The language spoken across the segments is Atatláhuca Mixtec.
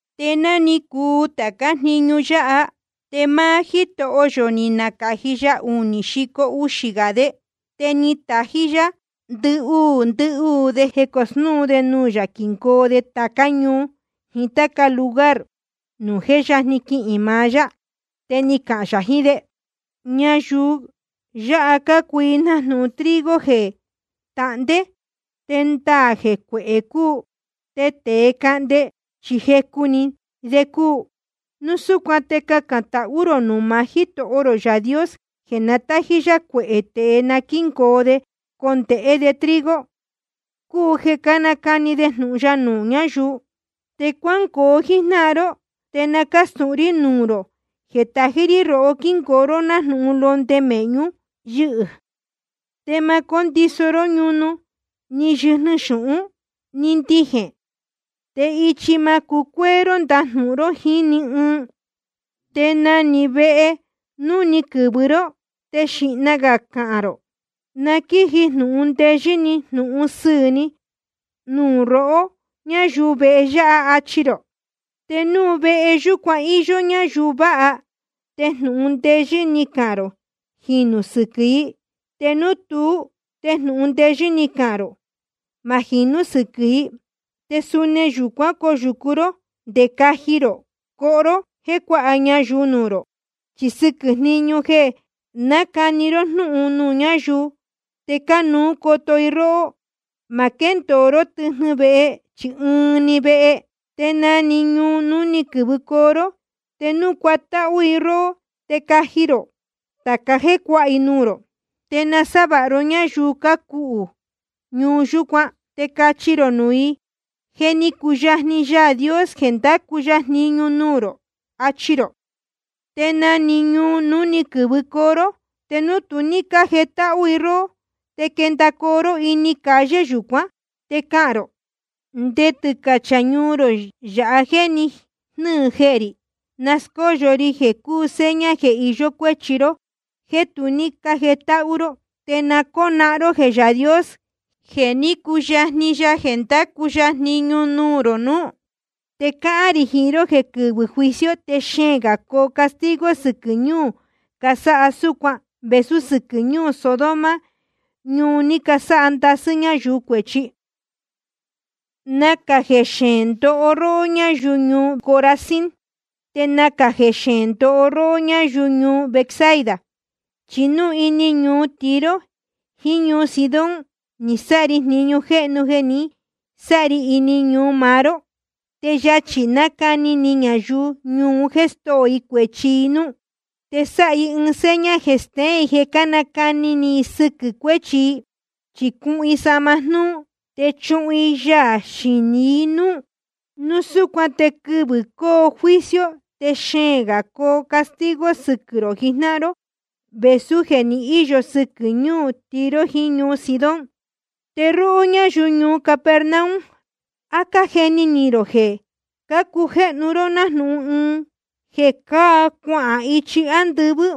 Te ná ni cuu tācá jniñu yáha, te máá Jítoho yō ni nacāji ya unī xico uxī gā de. Te ni tají yá ndɨhuū ndɨhuū de jeē cósnūú de nuū yā, quingoo de tācá ñuu jiín táca lugar nuū jé yajni quihīn maá yá. Te ni cahān yā jiín de: Ñayuu yáha cácuu i nájnūhun trigo jeē tahndé, te ndaā jeē cuehē cúu, te tēe cahnde chi jecu‑ni de cúu. Núu súcuan te cacān tahú rō nuū maá Jítoho rō Yaā Dios jeē na tájí yá cuehē tēe na quíngoo de cahnde de trigo, cúu jeē nacani de jnūhun ya nuū ñáyuu. Te cuángoo jíjnáhan ró, te na cástūhun rí nuū rō jeē tají rí rohó quíngoo ró nájnūhun londe mēhñu yɨ́hɨ̄. Te ma cóndiso ró ñunu, ni yɨjnɨ xūhún, ni ndijēn. Te ichi ma cucuéé ró ndajnūhun ró jíín ni ɨɨn. Te na‑ni vehe núu ni quɨ̄vɨ ró, te xīhna gā cahān rō: Na quíji jnūhun ndeyɨ́ jnūhun sɨɨ̄ ni nuū rohó, ñáyuu vehe yáha, achi rō. Te núu vehe yúcuan íyó ñáyuu vāha, te jnūhun ndeyɨ́ ní cahān rō jinū sɨquɨ̄ i. Te núu tuú, te jnūhun ndeyɨ́ ní cahān rō ma jinú sɨquɨ̄ i. Te suni vehe yúcuan coyūcu ró, te caji rō coho ró jéē cuáha ñayuu nuū rō. Chi sɨquɨ̄ jniñu jeē nácani ró jnúhun nuū ñáyuu, te cánuú coto i róhó. Ma quéndōo ró tɨjnɨ vehe, chi ɨɨn‑ni vehe. Te na‑ni ñuu núu ni quɨ̄vɨcoo ró, te núu cuatáhú i róhó, te caji rō tāca jéē cuáha i nuū rō. Te nasávāha ró ñáyuu cácuhū ñuu yūcuán. Te cachi rō nuū i: Je ni cuyajni Yaā Dios jeē ndacu ya jniñu nuū rō, achi rō. Te na‑ni ñuu núu ni quɨ̄vɨcoo ró, te núu tu ní cájetáhú i róhó, te quendacoo ró ini calle yūcuán, te cahān rō: Nde tɨcachā ñuu rō yāha jéē ni jnɨ́ɨ jehē rī, na náscóyo ri jeē cúu seña jeē iyó cuéchi ró jéē tu ní cájetáhú ró. Te na cónahán ró jeē Yaā Dios je ni cuyajni ya jeē ndacu ya jniñu nuū rō nuú. Te cáhán rī jiín ró jeē quɨvɨ̄ juicio te xeēn gā coo castigo sɨquɨ̄ ñuu casáha súcuan vēsú sɨquɨ̄ ñuu Sodoma nuū ní casáha ndasɨ́ ñáyuu cuēchi. ’Nacā jeē xeēn ndoho ró, ñáyuu ñuu Corazín. Te nacā jeē xeēn ndoho ró, ñáyuu ñuu Betsaida. Chi núu ini ñuu Tiro jiín ñuu Sidón ni sáha ri jniñu jéhnu jeē ni sáha ri ini ñuu maá ró, te yachī nacani ni ñayuu ñuu un jéē stóo i cuēchi i núú. Te sáha i seña jeē steén jeē nácani ni i sɨquɨ̄ cuéchi i, chi cuhun i sahma jnúú te chuhun i yaā xinī i núú. Núu súcuan te quɨvɨ̄ coo juicio te xeēn gā coo castigo sɨquɨ̄ rō jijnáhan ró vēsú jeē ni íyo sɨquɨ̄ ñuu Tiro jiín ñuu Sidón. Te róhó ñáyuu ñuu Capernaum, ¿á cájeni ni rō jeē cujéhnu ró nájnūhun ɨɨn jeē cáa cuahān ichi ándɨvɨ́?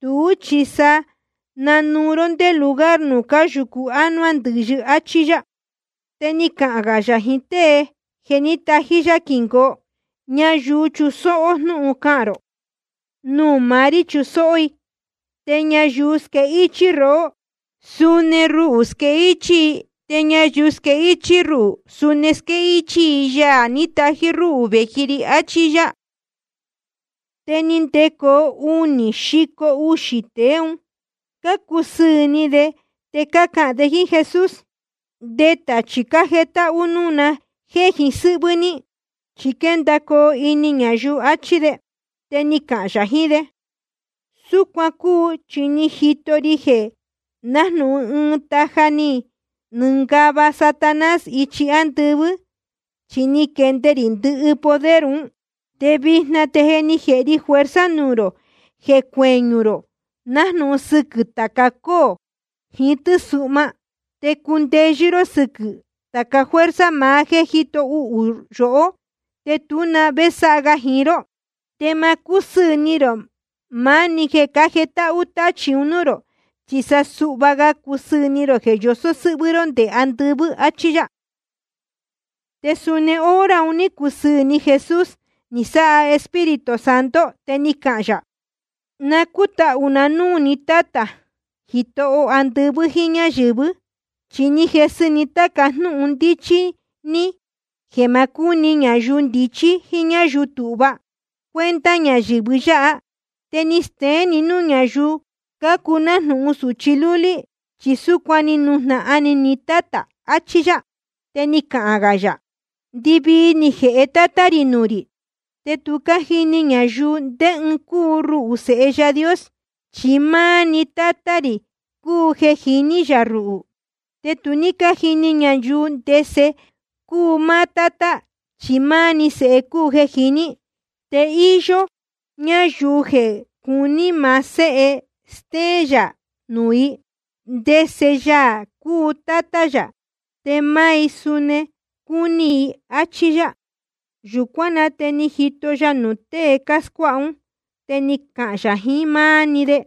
Tuú chi sa nanuu ró ndé lugar nuū cáyūcu ánuá ndɨ̄yɨ. Achí yá. Te ni cahān gā yā jiín tée jeē tají yá quingoo: Ñayuu chusóhó jnúhun cahān rō, nuū maá rí chusóhó i. Te ñayuu squéhichī rohó, suni ruhū squéhichī i. Te ñayuu squéhichī ruhū, suni squéhichī i Yaā ní tají rúhū vēji ri. Achí yá. Te ni ndecoo unī xico uxī tēe un, cácusɨɨ̄ ni de te cácahān de jíín Jesús: Nde tachī cájetáhú núū na jéē jiín sɨ́hvɨ́ ní, chi quéndacoo ini ñayuu, achí de. Te ni cahān yā jiín de: Súcuan cúu, chi ni jito ri jeē nájnūhun ɨɨn taja ni nɨngava Satanás ichi ándɨvɨ́, chi ni quende rī ndɨhɨ poder un. Te vijna te je ni jēhe ri fuerza nuū rō jeē cueñū rō nájnūhun sɨquɨ̄ tāca cóō jiín tɨ́suhma, te cundeyɨ́ ró sɨquɨ̄ tāca fuerza maá jéē jíto uhū yohó, te tú na vé sáha ga jiín ró. Te ma cúsɨɨ̄ ni rō maá‑ni jeē cájetáhú táchī nuū rō, chi sa cusɨɨ̄ gā ni rō jeē yosó sɨ́hvɨ́ ró nde andɨvɨ́. Achí yá. Te suni hora un ní cusɨɨ̄ ni Jesús, ni sáha Espíritu Santo, te ni cahān yā: Na cútahū na núū ni Tátā, Jitoho andɨvɨ́ jíín ñáyɨ̄vɨ́. Chi ni jesɨ ni táca jnúhun ndíchí ní, jeē ma cúni ñayuu ndichí jíín ñáyuu tūhva cuenta ñayɨ̄vɨ yáha. Te ni steén ni núū ñáyuu cácuu nájnūhun sūchi lúlí. Chi súcuan ni nujnahan ni ni Tátā, achí yá. Te ni cahān gā yā: Ndɨvii ni jēhe Tátá rī nuū rī. Te tu cájini ñayuu ndé ɨɨn cúu ruhū, Sēhe Yaā Dios, chi máá‑ni Tátá rī cúu jeē jiní yā ruhū. Ni tu cájini ñayuu ndese Yaā cúu máá Tátá, chi máá‑ni Sēhe cúu jeē jiní. Te íyó ñáyuu jeē cuní maá Séhe stéén yā nuū i ndese Yaā cúu Tátá yā, te máá i suni cuni i. Achí yá. Yūcuán na te jíto ya nuū tée cáscuáha ún, te ni cahān yā jiín máá‑ni de: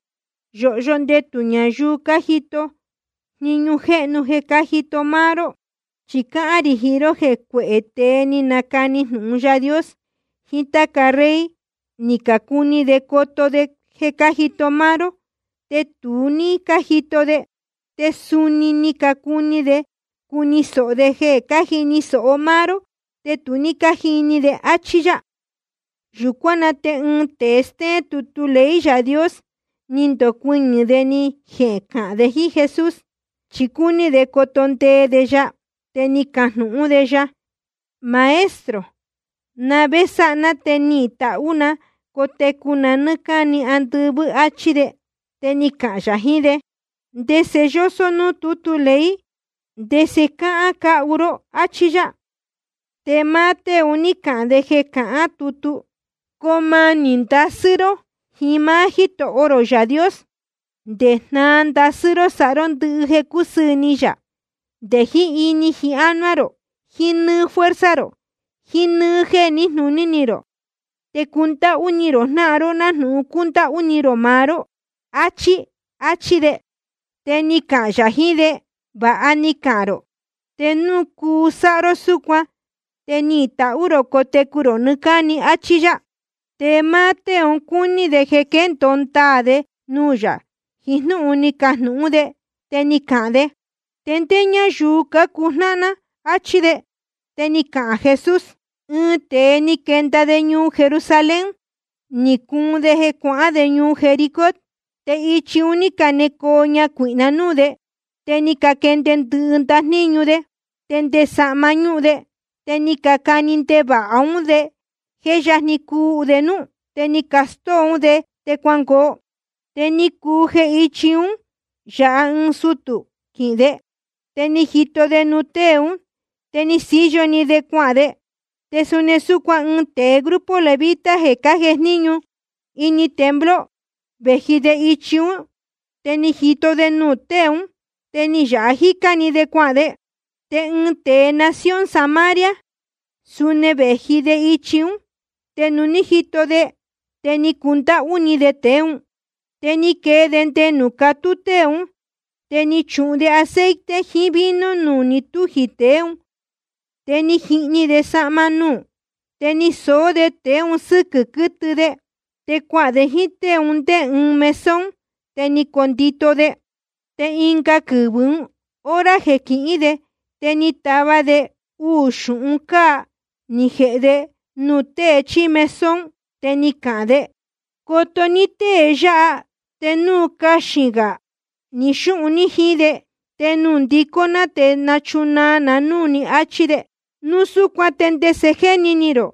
Yōhyo ndetū ñayuu cájito jniñu jéhnu jeē cájito máá ró. Chi cáhán rī jiín ró jeē cuehē tēe ni canacani jnūhun Yaā Dios, jiín táca rey, ni cacuni de coto de jeē cájito máá ró, te tu ní cájito de. Te suni ni cacuni de cuni sōho de jeē cájini sōho máá ró, te tu ní cájini de. Achí yá. Yūcuán na te ɨɨn tēe stéén tutu ley Yaā Dios, ni ndocuɨñɨ̄ de ni jecahān de jíín Jesús, chi cúní de coto ndee de ya. Te ni cajnūhún de: Maestro, ¿na vé sáha ná te nihīn tahú na cotecu na nɨ́ɨ́ cáni andɨvɨ́? áchí de. Te ni cahān yā jiín de: ¿Ndese yósó núū tútu ley? ¿Ndese cáhán cáhu ró? Achí yá. Te máá tée un ní cahān de jeē cahán nuū tútu: Coo manī ndasɨ́ ró jiín máá Jítoho rō Yaā Dios, nde jnáā ndasɨ́ ró sáha ró ndɨhɨ jeē cúsɨɨ̄ ni yā, nde jiín ini jiín ánuá rō, jiín nɨ́ɨ́ fuerza rō, jiín nɨ́ɨ́ jéē níjnūní rō. Te cundáhú ni rō jnáhan ró nájnūhun cúndáhú ni rō maá ró, achí. Achí de. Te ni cahān yā jiín de: Vāha ni cahān rō. Te núu cuu sáha ró súcuan te nihīn tahú rō cotecu rō nɨɨ́ cáni, áchí yá. Te máá tée un cúní de jeē quéndōo ndaā de nuū yā jiín jnúhun ni cajnūhún de, te ni cahān de: ¿Te ndé ñáyuu cácuu jnáhan ná? áchí de. Te ni cahān Jesús: Ɨɨn tēe ni quenda de ñuu Jerusalén, ni cuun de cuahān de ñuu Jericó. Te ichi un ní canecoo ñacuīhna núū de, te ni caquende ndɨhɨ ndajníñu de, te nde sahma ñúhun de. Te ni cacani ndevāha ún de jeē jé yajni cuu de núú. Te ni castóo ún de, te cuangoo. Te ni cuu jeē íchi un yáha ɨɨn sutū quihīn de, te ni jito de nuū tée ún, te ni síyo‑ni de cuahān de. Te suni súcuan ɨɨn tēe grupo levita jeē cájejníñu ini templo, vēji de ichi ún, te ni jito de nuū tée ún, te ni yāha jícá‑ni de cuahān de. Te ɨɨn tēe nación Samaria, suni vēji de ichi ún, te nuū ní jito de, te ni cundáhú ni de tēe ún. Te ni quee de nde nuū catú tée ún, te ni chuhun de aceite jiín vino nuū ni túji tēe ún, te ni jihni de sahma nuū. Te ni soó de tēe un sɨ́quɨ̄ quɨtɨ de, te cuahān de jíín tée un ndé ɨɨn mesón, te ni condito de. Te ɨnga quɨvɨ̄ ún, hora jeē quihín de, te ni tava de uū xūhun cáa, ni jēhe de nuū tēe chíí mesón. Te ni cahān de: Coto ní tée yáha, te núu caxīn gā ni xúhun ní jíín de, te nuū nándicó ná te nachunaa ná núū ní, áchí de. Núu súcuan ¿te ndese jéni ni rō?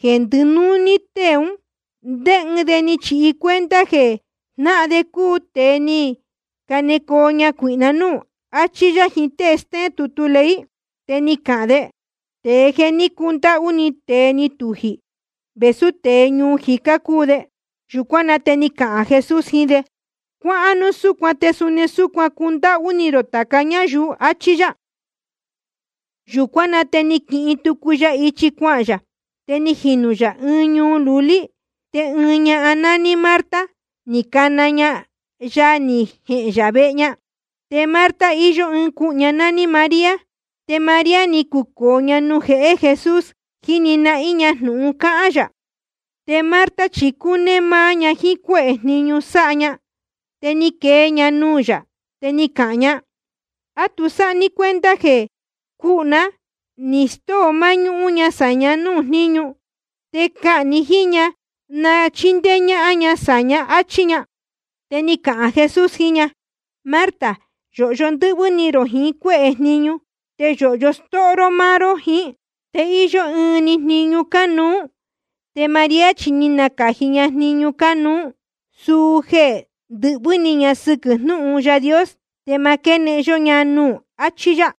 Jeē ndɨnúní tée ún, ¿ndé ɨɨn de ni chihi cuenta jeē jnáhan de cúu tēe ni canecoo ñacuīhna núū? Achí yá jiín tée stéén tutu ley. Te ni cahān de: Tēe jeē ní cundáhú ni tēe ni tujī, vēsú tēe ñuu jicá cúu de. Yūcuán na te ni cahān Jesús jiín de: Cuáhán núu súcuan, te suni súcuan cundáhú ni rō tāca ñáyuu, achí yá. Yūcuán na te ni quihin tucu ya ichi cuahān yā, te ni jinū yā ɨɨn ñuu lulí. Te ɨɨn ñahan nání Marta, ni cana ña ya ni jehēn yā vehe ña. Te Marta, íyó ɨɨn cuhū ña nání María. Te María ni cucōo ña nuū jehé Jesús, jíni nahín ña jnūhun cáhán yā. Te Marta chi cúnéé máá ña jíín cuéhē jniñu sáha ña. Te ni quee ña nuū yā, te ni cahān ña: ¿A tu sáha ní cuenta jeē cuhū na ní stóo máñúhún ña sāña núū jníñu? Te cahān ni jíín ña na chíndéé ñáhán ña sāñá, áchí ña. Te ni cahān Jesús jiín ña: Marta, yōhyo ndɨ́hvɨ́ ni rō jiín cuéhē jniñu, te yōhyo stóho ró máá ró jiín. Te íyó ɨɨn‑ni jniñu cánuú. Te María chi ni nacāji ña jniñu cánuú, suu jeē ndɨhvɨ́ ni ña sɨquɨ̄ jnúhun Yaā Dios, te ma quénehen yó ña nuū ún. Achí yá.